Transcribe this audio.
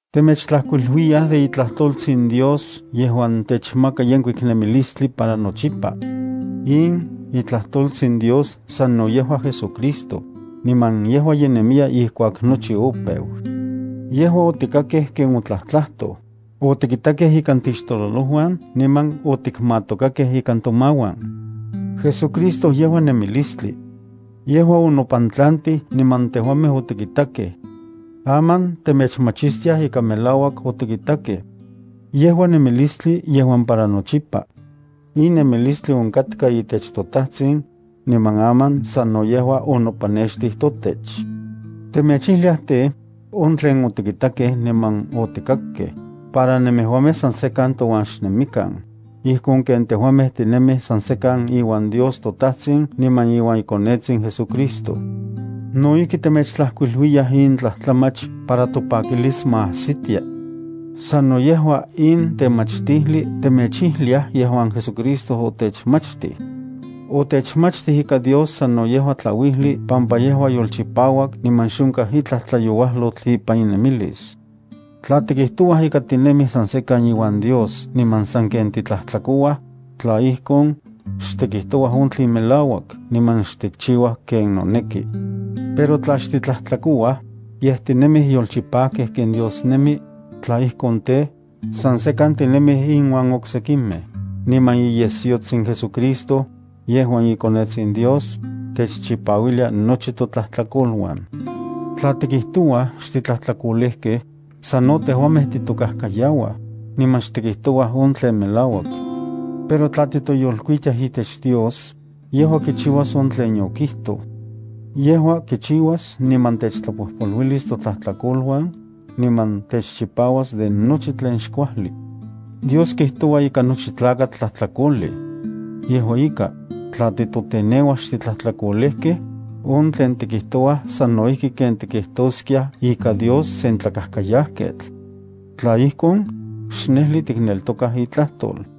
Temechtlajkuiluiyaj de iTlajtoltsin Dios yejuan techmaka yenkuik nemilistli para nochipa. In iTlajtoltsin Dios sano yejua JesuCristo, niman yejua ye nemiya ijkuak nochi opeu. Yejua otikakej ken otlajtlajtoj, otikitakej ikan tixtololojuan niman okikmatokakej ikan tomauan. JesuCristo yejua nemilistli. Yejua onopantlantij niman tejuamej otikitakej. Aman temechmachistiaj ika melauak otikitakej. Yejua nemilistli yejuan para nochipa. In nemilistli onkatka itech toTajtsin, niman aman sano yejua onopanextij totech. Temechijliaj tej, on tlen otikitakej niman otikakkej, para nemejuamej san sekan touan xnemikan, ijkon ken tejuamej tinemij san sekan iuan Dios toTajtsin niman iuan iKonetsin JesuCristo. No ijki temechtlajkuiluiyaj in tlajtlamach para topakilis ma ajsitia. Sano yejua in temachtijli temechchiliaj yejuan JesuCristo otechmachtij. Otechmachtij ika Dios sano yejua tlauijli pampa yejua yolchipauak niman xonkaj itlaj tlayouajlotl ipan inemilis. Tla tikijtouaj ika tinemij san sekan iuan Dios niman sanken titlajtlakouaj, tla ijkon, xtikijtouaj on tlen melauak niman xtikchiuaj ken noneki. Pero tla xtitlajtlakouaj, yej tinemij yolchipajkej ken Dios nemi, tla ijkon tej, san sekan tinemij inuan oksekimej, niman iyesyotsin JesuCristo, yejuan iKonetsin Dios, techchipauilia nochi totlajtlakoluan. Tla tikijtouaj xtitlajtlakolejkej, sano tejuamej titokajkayauaj, niman xtikijtouaj on tlen melauak. Pero tla titoyolkuitiaj itech Dios, yejua kichiuas on tlen okijtoj. Yejua kiyekchiuas niman techtlapojpoluilis totlajtlakoluan, niman techchipauas de nochi tlen xkuajli. Dios kijtoua ika nochi tlakatl tlajtlakolej. Yejua ika, tla titoteneuaj xtitlajtlakolejkej, on tlen tikijtouaj sano ijki ken tikijtoskiaj ika Dios sen tlakajkayajketl. Tla ijkon, xnejli tikneltokaj itlajtol.